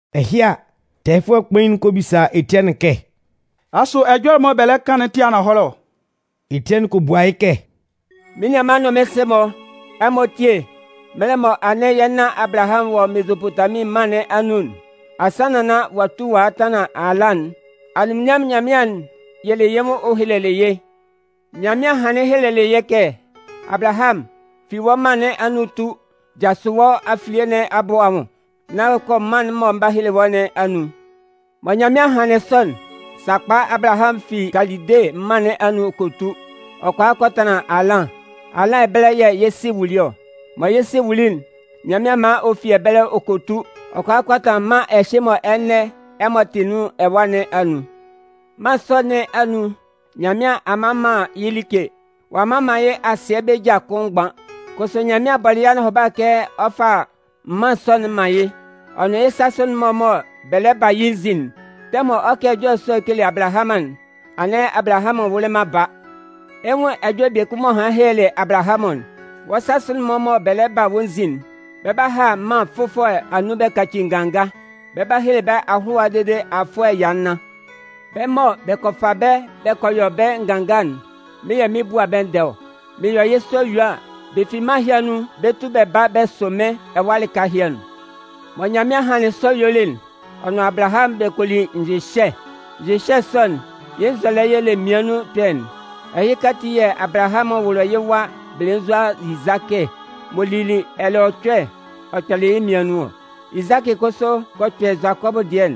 Ɛhɩ a, tɛɛyɩfʋɛ kpain'n kɔ bisa Etiɛnɩn kɛ: “Asʋ ɛjɔlɛ'n mɔ bɛ lɛ kan'n tɩ ananhɔlɛ ɔ?” Etiɛnɩn kɔ bua yɩ́ kɛ: “Mɩ́n nianman nʋn mɩ́n sɩ-mɔ, ɛmɔ tíe! Mɛlɛ mɔ anɩn yɛ́ nan Abalahamʋn wɔ Mezopotamin mân nɩn anun'n, asannan nán ɔ'a tu ɔ'a tanlan Halan'n, Anunminnyanmʋn Nyanmɩan'n yɩlɩ yɩ́ nwʋn ɔ helelɩ yɩ́. Nyanmɩan hanlɩn helelɩ yɩ́ kɛ: Abalahamʋn, fi wɔ́ mân nɩn anun tu, jasʋ wɔ́ afilie nɩn abʋ anwʋn nán kɔ mân'n mɔ mɩn 'ba hele wɔ́ nɩn anun. Mɔ Nyanmɩan hanlɩn sɔ'n, sakpa Abalahamʋn fi Kalide mân nɩn anun ɔ kɔ tu, ɔ kɔ a kɔ tanlan Halan. Halan ɛbɛlɛ yɛ̂ yɩ sɩ wuli ɔ. Mɔ yɩ́ sɩ wuli'n, Nyanmɩan man ɔ fi ɛbɛlɛ ɔ kɔ tu, ɔ kɔ a kɔ tanlan mân ɛhɩ mɔ ɛnɛ ɛmɔ tɩ nun ɛwa nɩn anun. Mân sɔ nɩn anun, Nyanmɩan a mman man yɩ́ like, ɔ'a mman man yɩ́ asɩɛ bɛ́ ja kʋn mgban. Kʋsʋ Nyanmɩan bɔlɩ yɩ́ anɔhʋba kɛ ɔ 'fa mân sɔ'n man yɩ́, ɔ nʋn yɩ́ sasʋ'n-mɔ mɔ bɛ lɛ ba a yɩ́ nzin'n. Tɛmʋn mɔ ɔ 'kan ɛjɔlɛ sɔ'n ɔ kele Abalahamʋn'n, anɩn Abalahamʋn wʋlɩ man baa. Ɛ 'nwun ɛjɔlɛ biekun m'ɔ hanlɩn helelɩ Abalahamʋn'n: Wɔ́ sasʋ'n-mɔ mɔ bɛ lɛ ba a wɔ́ nzin'n, bɛ 'ba ha mân fʋfɔlɛ anun bɛ kaci nganga. Bɛ 'ba hele bɛ́ ahʋlʋwa dede afʋɛ ɛya nnan. Bɛ́ mɔ bɛ kɔ fa bɛ́ bɛ kɔ yɔ bɛ́ nganga'n, mɩ́n yɛ̂ mɩn 'bua bɛ́ ndɛɛ ɔ. Mɩn yɔ yɩ́ sɔ yue a, bɛ fi mân sɔ nɩn anun bɛ 'tu bɛ ba bɛ sʋ mɩ́n ɛwa lɩka ɛhɩ anun. Mɔ Nyanmɩan hanlɩn sɔ yuelɩ'n, ɔ nʋn Abalahamʋn bɛ kɔ li nyɩhyɛ. Nyɩhyɛ sɔ'n, yɩ́ nzɔlɛ y'ɔ le mmian nun ɛkpɛ'n. Ɛhɩka ati yɛ̂ Abalahamʋn wʋlɩ yɩ́ wa belenzua Izakɩ m'ɔ lili ɛlɛɔcʋɛ'n, ɔ kpɛlɩ yɩ́ mmian nun nɩn ɔ. Izakɩ kʋsʋ kɔ kpɛ Zʋakɔbʋ dɩɛ'n.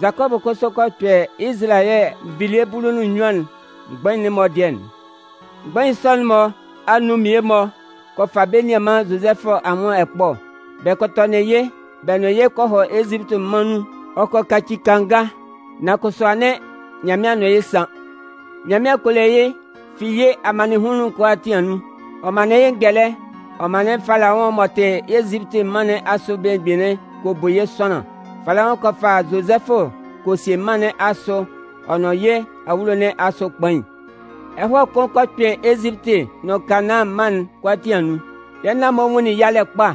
Zʋakɔbʋ kʋsʋ kɔ kpɛ Izalayɛ nvilie bulu nʋn nnyuan'n mgbain'n-mɔ dɩɛ'n. “Mgbain sɔ'n-mɔ anun mmie-mɔ kɔ fa bɛ́ nianman Zozɛfʋ anwʋn ɛkpɔ. Bɛ kɔ tɔnɩn yɩ́. Bɛ nʋn yɩ́ kɔ hɔ Ezipiti mân nun ɔ kɔ kaci kanga. Nan kʋsʋ anɩn Nyanmɩan nʋn yɩ́ san. Nyanmɩan kɔ le yɩ́ fi yɩ́ amannɩnhunlun'n kʋalaatin anun. Ɔ manlɩn yɩ́ ngɛlɛ ɔ manlɩn Falaʋn m'ɔ tɩ Ezipiti mân nɩn asʋ belemgbin'n kɔ bu yɩ́ sʋanlan. Falaʋn kɔ fa Zozɛfʋ kɔ sie mân nɩn asʋ ɔ nʋn yɩ́ awulo nɩn asʋ kpain. Ɛhɔɛ kʋn kɔ kpɩn Ezipiti nʋn Kanaân mân'n kʋalaatin anun. Yɛ́ nan-mɔ nwunlin yalɛ kpa,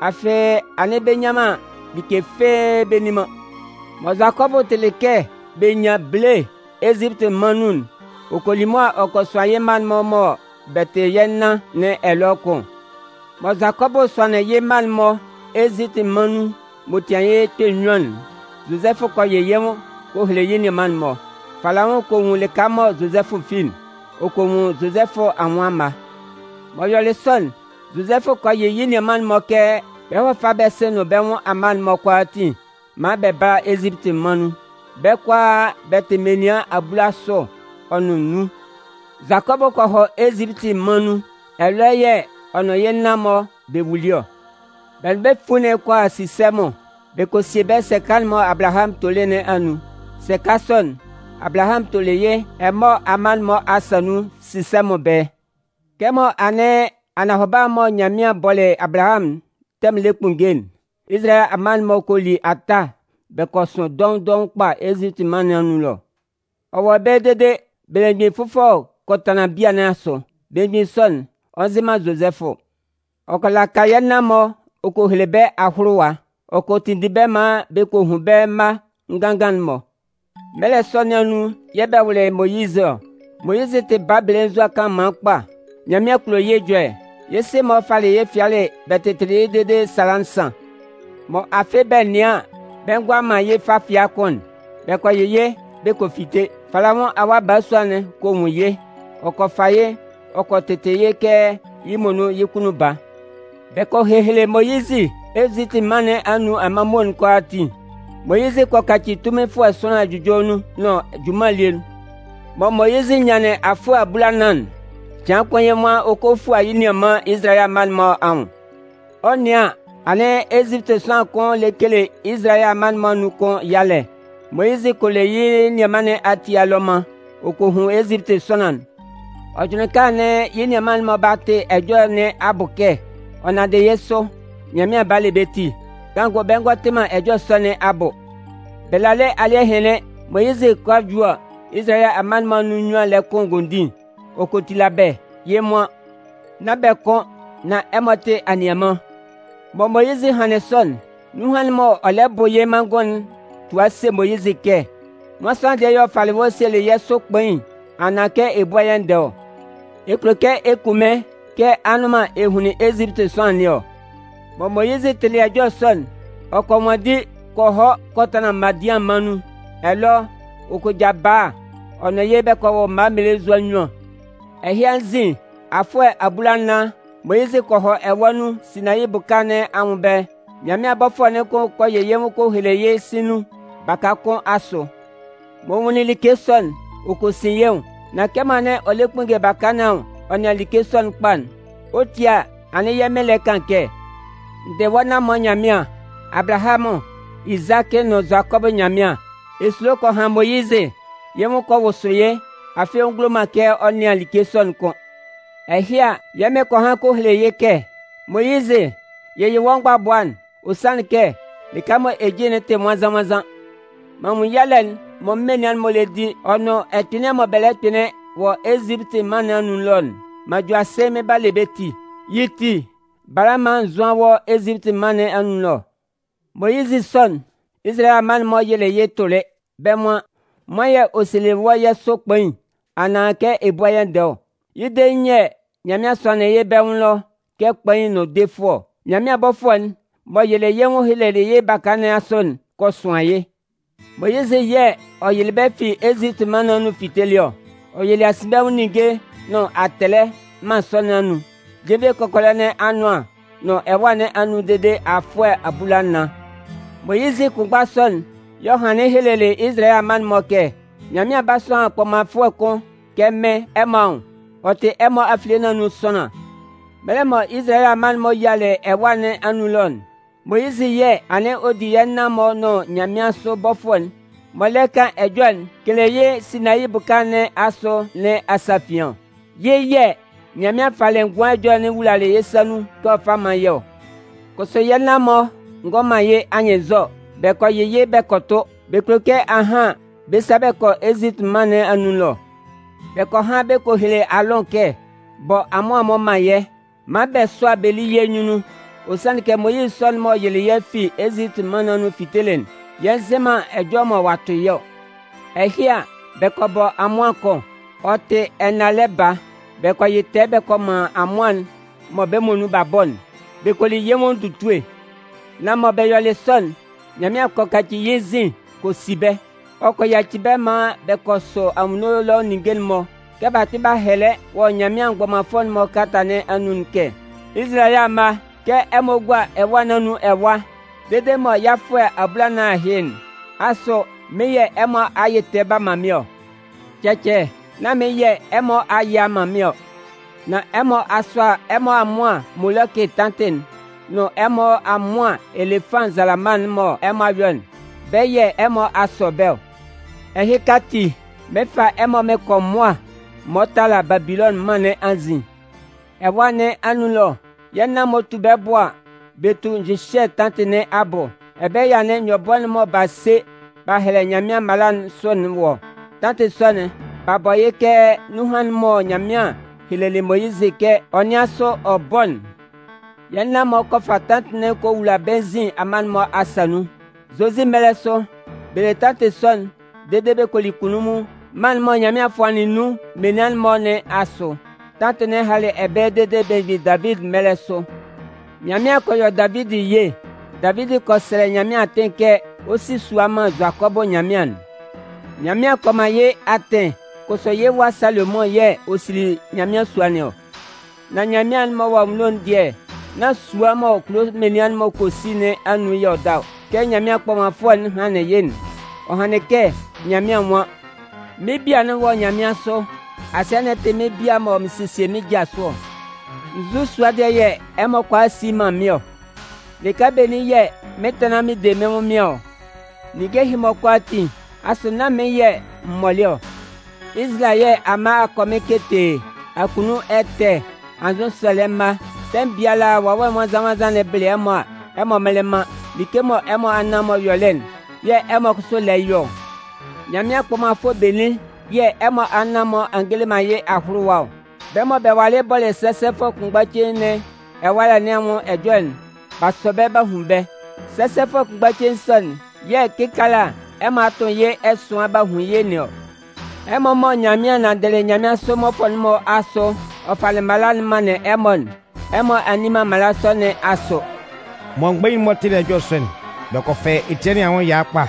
afɩ anɩn bɛ nnyan man like fɩ́ɩ́ bɛ nni man. “Mɔ Zʋakɔbʋ tɩlɩ kɛ bɛ nyan bele Ezipiti mân nun'n, ɔ kɔ li mʋa ɔ kɔ sʋan yɩ́ mma'n-mɔ mɔ bɛ tɩ yɛ́ nan nɩn ɛlɔ kʋn. Mɔ Zʋakɔbʋ sʋanlɩn yɩ́ mma'n-mɔ Ezipiti mân nun m'ɔ tɩan yɩ́ kpɛ nnyuan'n, Zozɛfʋ kɔ yɩ yɩ́ nwʋn kɔ hele yɩ́ nianman'n-mɔ. Falaʋn kɔ nwun lɩka mɔ Zozɛfʋ fi'n, ɔ kɔ nwun Zozɛfʋ anwʋn amma. M'ɔ yɔlɩ sɔ'n, Zozɛfʋ kɔ yɩ yɩ́ nianman'n-mɔ kɛ bɛ hɔ́ fá bɛ́ sɩ nʋn bɛ́ nwʋn amma'n-mɔ kʋalaatin, maan bɛ bála Ezipiti mân nun. Bɛ́ kʋalaa, bɛ tɩ menian abulasʋ ɔ nʋn nnun. Zʋakɔbʋ kɔ hɔ Ezipiti mân nun. Ɛlɔ yɛ̂ ɔ nʋn yɛ́ nan-mɔ bɛ wuli ɔ. Bɛ nʋn bɛ́ fuin'n kɔ hɔ Sisɛmʋn. Bɛ kɔ sie bɛ́ sɛka'n mɔ Abalahamʋn tolɩ nɩn anun. Sɛka sɔ'n, Abalahamʋn tolɩ yɩ́ Emɔɔ amma'n-mɔ asa nun Sisɛmʋn ɛbɛlɛ. “Kɛmɔ anɩn anɔhʋba'n mɔ Nyanmɩan bɔlɩ Abalahamʋn'n tɛmʋn'n lɛ kpunnge'n, Izalayɛ amma'n-mɔ kɔ li ata bɛ kɔ sʋn dɔʋn dɔʋn kpa Ezipiti mân nɩn anun ɛlɔ. Ɔ wɔ ɛbɛlɛ dede belemgbin fʋfɔlɛ kɔ tanlan bia nɩn asʋ. Belemgbin sɔ'n, ɔ'a nzɩ man Zozɛfʋ. Ɔ kɔ laka yɛ́ nan-mɔ ɔ kɔ hele bɛ́ ahʋlʋwa. Ɔ kɔ tinndin bɛ́ maan bɛ kɔ hun bɛ́ mma ngangan'n-mɔ. “Mɛlɛ sɔ nɩn anun yɛ̂ bɛ wʋlɩ Moyizɩ ɔ. Moyizɩ tɩ baa belenzua kanlanman kpa. Nyanmɩan kulo yɩ́ ɛjɔlɛ. Yɩ́ sɩ-mɔ falɩ yɩ́ fɩalɩ bɛ tɩtɩlɩ yɩ́ dede sala nsan. Mɔ afɩ bɛ nɩan an bɛ ngʋala man yɩ́ fa fɩa kʋ́n'n, bɛ kɔ yɩ yɩ́ bɛ kɔ fite. Falaʋn awa balasua'n kɔ nwun yɩ́, ɔ kɔ fa yɩ́ ɔ kɔ tɩtɩ yɩ́ kɛ yɩ́ muonun yɩ́ kunnun baa. Bɛ kɔ hehele Moyizɩ Ezipiti mân nɩn anun amanmuo'n kʋalaatin. Moyizɩ kɔ kaci tunminfʋɛ sʋanlan ɛjʋjɔlɛ nun nʋn junman elie nun. “Mɔ Moyizɩ nyanlɩn afʋɛ abulanan'n, cɩan kʋn yɩ́ nwan ɔ 'kɔ a fua yɩ́ nianman Izalayɛ amma'n-mɔ anwʋn. Ɔ 'nɩan an, anɩn Ezipiti sʋanlan kʋn lɛ kele Izalayɛ amma'n-mɔ anun kun yalɛ. Moyizɩ kɔ le yɩ́ nianman nɩn ati alɔman ɔ kɔ hun Ezipiti sʋanlan'n. Ɔ jʋnlɩn kɛ anɩn yɩ́ nianman'n-mɔ 'ba tɩ ɛjɔlɛ nɩn abʋ kɛ, ɔ nanndɩ yɩ́ sʋ, Nyanmɩan 'ba le bɛ́ ti. Kanngʋ bɛ ngɔ tɩ man ɛjɔlɛ sɔ nɩn abʋ. Bɛ lalɩ alɩ́ɛ hɩnlɩn, Moyizɩ 'kɔ a ju a, Izalayɛ amma'n-mɔ anun nnyuan lɛ kʋn ngondin. Ɔ kɔ tila bɛ́. Yɩ́ nwan: ‘Nán bɛ kʋn, nán ɛmɔ tɩ anianman.’ “Mɔ Moyizɩ hanlɩn sɔ'n, nunhan'n m'ɔ lɛ bʋ yɩ́ manngʋn'n tua se Moyizɩ kɛ: Nwan sʋanlan dɩɛ y'ɔ falɩ wɔ́ sielɩ yɛ́ sʋ kpain anaan kɛ ɛ búa yɛ́ ndɛɛ ɔ? Ɛ kulo kɛ ɛ kun mɩ́n kɛ anʋ́nman ɛ hunlin Ezipiti sʋanlan nɩn ɔ? “Mɔ Moyizɩ tɩlɩ ɛjɔlɛ sɔ'n, ɔ kɔ nwanndi kɔ hɔ kɔ tanlan Madian mân nun. Ɛlɔ, ɔ kɔ ja bala ɔ nʋn yɩ́ bɛ kɔ wʋ mma mmelenzua nnyuan. “Ɛhɩ anzin afʋɛ abulanan, Moyizɩ kɔ hɔ ɛwâ nun Sinayi bʋka nɩn anwʋn ɛbɛlɛ. Nyanmɩan bɔfʋɛ'n kʋn kɔ yɩ yɩ́ nwʋn kɔ hele yɩ́ sɩ̂n nun baka kʋn asʋ. M'ɔ nwunlin like sɔ'n, ɔ kɔ sin yɩ́ nwʋn. Nan kɛmɔ anɩn ɔ lɛ kpunnge baka nɩn anwʋn ɔ nɩan like sɔ'n kpa'n, ɔ 'tie a anɩn yɛ́ Mɩn lɛ kan kɛ: N dɩ wɔ́ nan-mɔ Nyanmɩan, Abalahamʋn, Izakɩ nʋn Zʋakɔbʋ Nyanmɩan. Esulo kɔ han Moyizɩ, yɩ́ nwʋn kɔ wʋsʋ yɩ́, afɩ ɔ ngulo man kɛ ɔ nɩan like sɔ'n kʋ́n. Ɛhɩ a, yɛ́ Mɩn kɔ han kɔ hele yɩ́ kɛ: Moyizɩ, yɩyɩ wɔ́ mgbabʋa'n, ɔ sanlɩn kɛ, lɩka'n mɔ ɛ jin'n tɩ nwannzan-nwannzan. M'an nwun yalɛ'n mɔ mɩ́n menian'n-mɔ lɛ di ɔ nʋn ɛkpɩnlɩan mɔ bɛ lɛ kpɩnlɩn wɔ Ezipiti mân nɩn anun ɛlɔ'n. M'an ju asɩ mɩn 'ba le bɛ́ ti. Yɩ́ ti, bala maan n zʋ́an wɔ́ Ezipiti mân nɩn anun ɛlɔ. “Moyizɩ sɔ'n, Izalayɛ amma'n-mɔ yɩlɩ yɩ́ tʋlɩ. Bɛ́ nwan: Nwan yɛ̂ ɔ sielɩ wɔ́ yɛ́ sʋ kpain anaan kɛ ɛ búa yɛ́ ndɛɛ ɔ? Yɩ́ dein yɛ̂ Nyanmɩan sʋanlɩn yɩ́ bɛ́ nwʋn ɛlɔ kɛ kpain nʋn defʋɛ ɔ. Nyanmɩan bɔfʋɛ'n m'ɔ yɩlɩ yɩ́ nwʋn helelɩ yɩ́ baka nɩn asʋ'n kɔ suan yɩ́. Moyizɩ yɛ̂ ɔ yɩlɩ bɛ́ fi Ezipiti mân nɩn anun fitelɩ ɔ. Ɔ yɩlɩ asinbɛnwʋn ninnge nʋn atɛlɛ mân sɔ nɩn anun, jenvie kɔkɔlɛ nɩn anʋan nʋn ɛwâ nɩn anun dede afʋɛ abulanan. “Moyizɩ kʋnmgba sɔ'n yɛ̂ ɔ hanlɩn helelɩ Izalayɛ amma'n-mɔ kɛ: Nyanmɩan 'ba sʋan kpɔmanfʋɛ kʋn kɛ mɩ́n ɛmɔ anwʋn. Ɔ tɩ ɛmɔ afilie nɩn anun sʋanlan. “Mɛlɛ mɔ Izalayɛ amma'n-mɔ yialɩ ɛwâ nɩn anun ɛlɔ'n, Moyizɩ yɛ̂ anɩn ɔ di yɛ́ nan-mɔ nʋn nyanmɩansʋ bɔfʋɛ'n m'ɔ lɛ kan ɛjɔlɛ'n kele yɩ́ Sinayi bʋka nɩn asʋ nɩn asafian ɔ. Yɩ́ yɛ̂ Nyanmɩan falɩ ngʋan ɛjɔlɛ'n wulalɩ yɩ́ sa nun kɛ ɔ fá mán yɛ́ ɔ. “Kʋsʋ yɛ́ nan-mɔ ngɔ man yɩ́ anyɩnnzɔ, bɛ kɔ yɩ yɩ́ bɛ kɔ tʋ, bɛ kulo kɛ ahan bɛ sa bɛ kɔ Ezipiti mân nɩn anun ɛlɔ. Bɛ kɔ han bɛ kɔ hele Aalʋn kɛ: Bɔ amʋan-mɔ man yɛ́, man bɛ sʋ́a bɛ lí yɛ́ nyunnun. Ɔ sanlɩn kɛ Moyizɩ sɔ'n m'ɔ yɩlɩ yɛ́ fi Ezipiti mân nɩn anun fitelɩ'n, yɛ nzɩ man ɛjɔlɛ mɔ ɔ'a tʋ yɩ́ ɔ. “Ɛhɩ a, bɛ kɔ bɔ amʋan kʋn, ɔ tɩ ɛnalɛ baa. Bɛ kɔ yɩ tɛɛ bɛ kɔ man amʋan'n mɔ bɛ́ muonun b'a bɔ'n, bɛ kɔ li yɩ́ nwʋn ndutue. “Nan mɔ bɛ yɔlɩ sɔ'n, Nyanmɩan kɔ kaci yɩ́ nzin kɔ si bɛ́. Ɔ kɔ yaci bɛ́ maan bɛ kɔ sɔ anwunno ɛlɔ ninnge'n-mɔ, kɛ b'a kpɩn b'a hɛlɛ wɔ Nyanmɩan mgbɔmanfʋɛ'n-mɔ kalata nɩn anun'n kɛ: Izalayɛ amma, kɛ ɛmɔ gua ɛwâ nɩn anun ɛwa dede mɔ yɩ́ afʋɛ abulanan ahɩ'n, asʋ mɩ́n yɛ̂ ɛmɔ a yɩ tɛɛ b'a man mɩ́n ɔ? Cɛcɛ, nan mɩ́n yɛ̂ ɛmɔ a yɩ a man mɩ́n ɔ. Nan ɛmɔ a sʋa ɛmɔ amʋan Molɔkɩ tantɩ'n ɔ nʋn ɛmɔ amʋan Elefan nzalama'n mɔ ɛmɔ a yɔ'n, bɛ́ yɛ̂ ɛmɔ a sɔ bɛ́ ɔ. Ɛhɩka ati, mɩn 'fa ɛmɔ mɩn kɔ mʋa m'ɔ tala Babilɔnʋn mân nɩn anzin. “Ɛwâ nɩn anun ɛlɔ, yɛ́ nan-mɔ 'tu bɛ́ bʋ a, bɛ tu nyɩhyɛ tantɩ nɩn abʋ. Ɛbɛlɛ yɛ̂ anɩn nyɔbʋɛ'n mɔ b'a se b'a hɛlɛ Nyanmɩan mala'n sʋ'n wɔ ɔ. Tantɩ sɔ'n, b'a bɔ yɩ́ kɛ nunhan'n mɔ Nyanmɩan helelɩ Moyizɩ kɛ ɔ nɩ́an sʋ ɔ bɔ́'n. Yɛ́ nan-mɔ kɔ fa tantɩ'n kɔ wula bɛ́ nzin menian'n-mɔ asa nun. Zozie mɛlɛ sʋ, bɛ le tantɩ sɔ'n dede bɛ kɔ li kunnunmun mân'n mɔ Nyanmɩan fʋanlɩn nun menian'n-mɔ nɩn asʋ. Tantɩ'n halɩ ɛbɛlɛ dede belemgbin Davidi mɛlɛ sʋ. “Nyanmɩan kɔ yɔ Davidi ye. Davidi kɔ sɛlɛ Nyanmɩan atɩn kɛ ɔ 'si sua man Zʋakɔbʋ Nyanmɩan'n. Nyanmɩan kɔ man yɩ́ atɩn, kʋsʋ yɩ́ wa Salomʋn yɛ̂ ɔ sili Nyanmɩan sua nɩn ɔ. “Nan Nyanmɩan'n m'ɔ wɔ anwunno'n dɩɛ, nan sua mɔ kulo menian'n-mɔ kɔ si nɩn anun yɛ̂ ɔ da ɔ. Kɛ Nyanmɩan kpɔmanfʋɛ'n hanlɩn yɩ́'n, ɔ hanlɩn kɛ Nyanmɩan nwan: Mɩ́n bia'n wɔ nyanmɩansʋ, asɩɛ'n tɩ bia mɔ mɩn sesie mɩ́n ja sʋ ɔ. Nzu sua dɩɛ yɛ ɛmɔ kʋala si man mɩ́n ɔ? Lɩka benin yɛ̂ mɩn 'tanlan mɩn de mɩ́n ɛnwʋnmɩan ɔ? Ninnge ɛhɩ-mɔ kʋalaatin, asʋ nán mɩ́n yɛ̂ m mɔlɩ ɔ? “Izalayɛ amma akɔmɩn ketee, akunnun ɛtɛ, anzʋsɛlɛ mma, tɛmʋn biala Wawɛ Nwannzan-nwannzan'n bɩlɩ ɛmɔ a, ɛmɔ mmɩlɩ man. Like mɔ ɛmɔ anan-mɔ yɔlɩ'n yɛ̂ ɛmɔ kʋsʋ lɛ yɔ ɔ. Nyanmɩan kpɔmanfʋɛ benin yɛ̂ ɛmɔ anan-mɔ a ngele man yɩ́ ahʋlʋwa ɔ? Bɛ́ mɔ bɛ walɩ bɔlɩ sɛsɛfʋɛ kʋnmgba cein nɩn ɛwalɛ nɩn anwʋn ɛjɔlɛ'n, b'a sɔ bɛ́ b'a hun bɛ́. Sɛsɛfʋɛ kʋnmgba cein sɔ'n yɛ̂ kɩkaala ɛmɔ a tʋ yɩ́ ɛsʋan b'a hun yɩ́ nɩn ɔ. Ɛmɔ mɔ Nyanmɩan nanndɩlɩ nyanmɩansʋ mmɔfʋɛ'n-mɔ asʋ ɔ falɩ mala'n manlɩn ɛmɔ'n, ɛmɔ a nni man mala sɔ nɩn asʋ!” Mɔ mgbain'n-mɔ tɩlɩ ɛjɔlɛ sɔ'n, bɛ kɔ fɛ Etiɛnɩn anwʋn ɛya kpa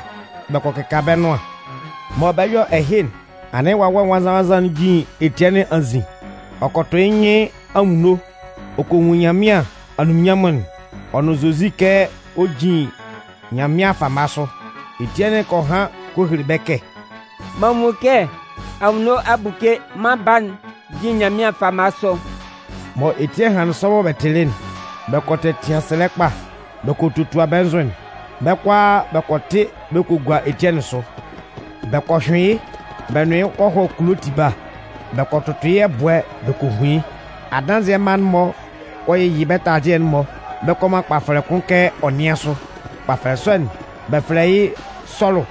bɛ kɔ kɩka bɛ́ nʋan. Mɔ bɛ 'yɔ ɛhɩ'n, anɩn Wawɛ Nwannzan-nwannzan'n jin Etiɛnɩn anzin. Ɔ kɔ tʋ yɩ́ nyɩn anwunno ɔ kɔ nwun Nyanmɩan anunminnyanmʋn'n, ɔ nʋn Zozi kɛ ɔ jin Nyanmɩan fama sʋ. Etiɛnɩn kɔ han kɔ hele bɛ́ kɛ: “M'an nwun kɛ anwunno a buke, Mân Baa'n jin Nyanmɩan fama sʋ.” Mɔ Etiɛnɩn hanlɩn sɔ mɔ bɛ tɩlɩ'n, bɛ kɔ tɛtɩan sɛlɛ kpa, bɛ kɔ totua bɛ́ nzʋ'n. Bɛ́ kʋalaa bɛ kɔ tɩ bɛ kɔ gua Etiɛnɩn sʋ. Bɛ kɔ hyʋɩn yɩ́ bɛ nʋn yɩ́ kɔ hɔ kulo tiba, bɛ kɔ tʋtʋ yɩ́ ɛbʋɛ bɛ kɔ hun yɩ́. Adanzɩɛ mma'n-mɔ kɔ yɩyɩ bɛ́ taladɩɛ'n-mɔ bɛ kɔ man kpafɛlɛ kʋn kɛ ɔ nɩ́an sʋ. Kpafɛlɛ sɔ'n, bɛ fɛlɛ yɩ́ Sɔlʋ.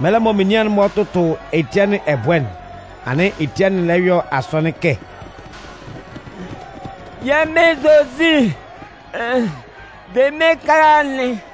Mɛlɛ mɔ menian'n-mɔ 'tʋtʋ Etiɛnɩn ɛbʋɛ'n, anɩn Etiɛnɩn lɛ yɔ asɔnɩn kɛ: “Yɛ́ Mɩn Zozi, de mɩ́n ɛkala'n!”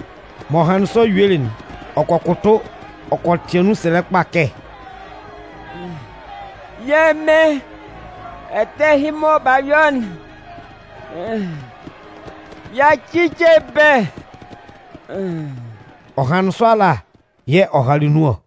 M'ɔ hanlɩn sɔ yuelɩ'n, ɔ kɔ kʋtʋ ɔ kɔ tɩan nun sɛlɛ kpa kɛ: “Yɛ́ Mɩn, ɛtɛ ɛhɩ mɔ b'a yɔ'n, yaci ce bɛ́!” Ɔ hanlɩn sɔ ala yɛ̂ ɔ halɩ nun ɔ.